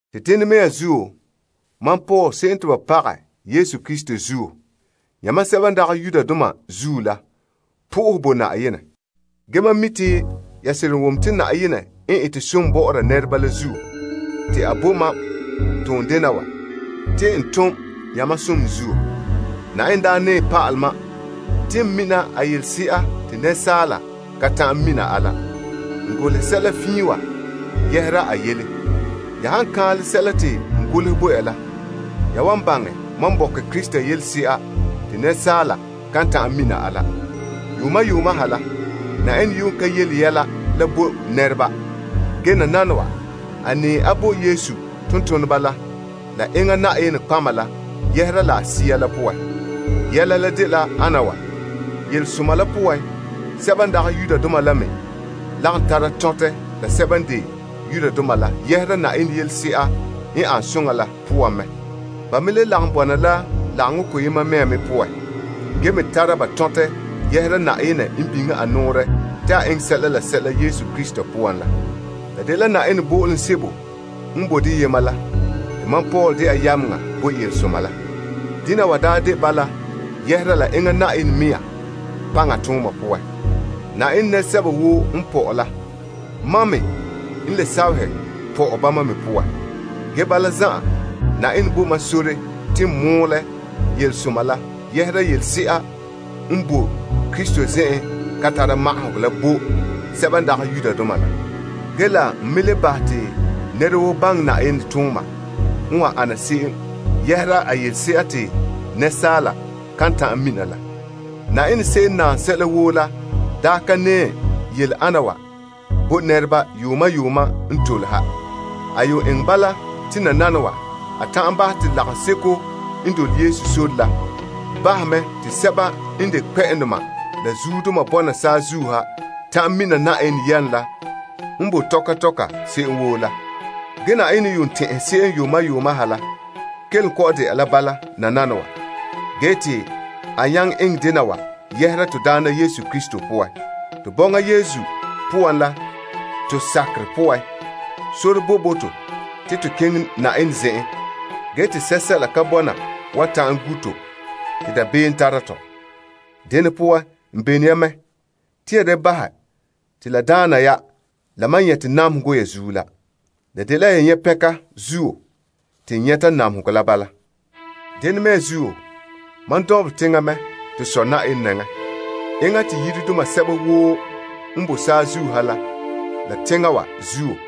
Te dene mea zuo mam Paul se'em te ba pagɛ Krista Yesu zuo yamam sɛba n dagɛ Yudoma zuo la, n sohore la Yenɛ. Ge mam mi' te ya seren wom te Yenɛ n ete som bɔ'ɔra nɛreba la zuo, te a bo mam toondena wa te n tom ya mam som zuo. Yenɛ daa nɛɛ pa'alɛ mam te n mina a yelese'a te asaala ka ta'an mina a la. N golehɛ sɛla fiin wa yɛhera a yɛla. Ya han kan'anlɛ sɛla te n golehɛ bo ya la, ya wan baŋɛ mam bɔkɛ Krista yelese'a te asaala kan ta'an mina a la. Yuuma yuuma ha la, Yenɛ ka yele yɛla la bo nɛreba la. Ge nananawa, a nɛɛ a bo Yesu tontoneba la la nɔtɔgɔheba la yɛhera la a Sea la poan. Yɛla la dela ana wa, yelesoma la poan, sɛba n dagɛ Yudoma la me lagom tara tɔntɛ la sɛba n de Israeldoma la yɛhera Yenɛ som la poan mɛ. Ba me le lagom bɔna la lagaŋɔ koyema mea me poan, ge me tara ba tɔntɛ yɛhera Yenɛ n biŋe a nɔɔrɛ doohe Krista Yesu poan. La dela Yenɛ zo'o'hogɔ bo'olom sebo n boe deyema la te mam dɛna yameŋa bo yelesoma la. Dena wa daa de bala yɛhera la enŋa Yenɛ mɛŋa paŋatooma poan. Yenɛ nɛresɛba woo n pɔ'ɛ la, mam me n le sahɛ pɔ'ɛ bama me poan. Ge bala zan'an, Yenɛ bo mam sore te n mɔɔlɛ yelesoma la yɛhera yelese'a n boe Krista zen'en ka tara magahegɔ la bo sɛba n dagɛ Yudoma la. Ge la n me le bahɛ te nɛra woo baŋɛ Yenɛ tooma n wan ana se'em yɛhera a yelese'a te asaala kan ta'an mina la. Yenɛ se'em n naam sɛla woo la daa ka nɛɛ yele ana wa bo nɛreba yuuma yuuma n tole ha. A yuun eŋɛ bala te nananawa, a ta'an bahɛ te lagaŋseko n dole Yesu sore la bahɛ mɛ te sɛba n de kpɛ'ɛndoma la zuodoma bɔna saazuo ha ta'an mina Yenɛ yam la n boe tɔka tɔka se'em woo la. Ge Yenɛ n tɛn'ɛhɛ se'em yuuma yuuma ha la kelom kɔ'ɔn dɛna la bala nananawa te a nyaŋɛ eŋɛ dena wa yɛhera Yesu Krista to Na'ayenɛ poan. To bɔŋa Yesu poan la to sakerɛ poan, sore boe bo to te to keŋɛ Yenɛ zen'en te sɛsɛla ka bɔna wan ta'an gu' to te dabeem tara tɔ. Dene poan, n bene ya mɛ, te ya da bahɛ te la daana ya la mam nyɛte namehegɔ ya zuo la. La dela ya nyɛ' pɛnka zuo te n nyɛta namehegɔ la bala. Dene mea zuo, mam dɔnbelɛ teŋa mɛ to Sɔ Yenɛ nɛŋa. Enŋa n de sɔ bo yiredoma sɛba woo n boe saazuo ha la teŋa wa zuo.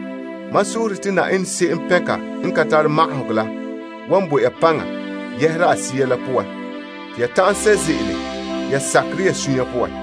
Mam sohore te Yenɛ se'em pɛnka n ka tare magahegɔ la wan bo ya paŋa yɛhera a Sea la poan te ya ta'an sɛ' ze'ele ya sakerɛ ya suunre poan.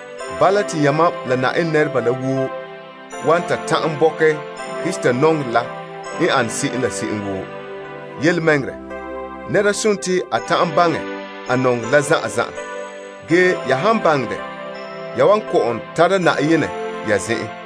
Bala, te yamam la Yenɛ nɛreba la woo wan ta ta'an bɔkɛ Krista nɔŋerɛ la yaleŋa la bo ko'olom ane se'em. Yelemɛŋɛrɛ, nɛra nare te a ta'an baŋɛ a nɔŋerɛ la zan'an zan'an. Ge ya han baŋɛ dɛ ya wan kɔ'ɔn tara Yenɛ ya zen'an.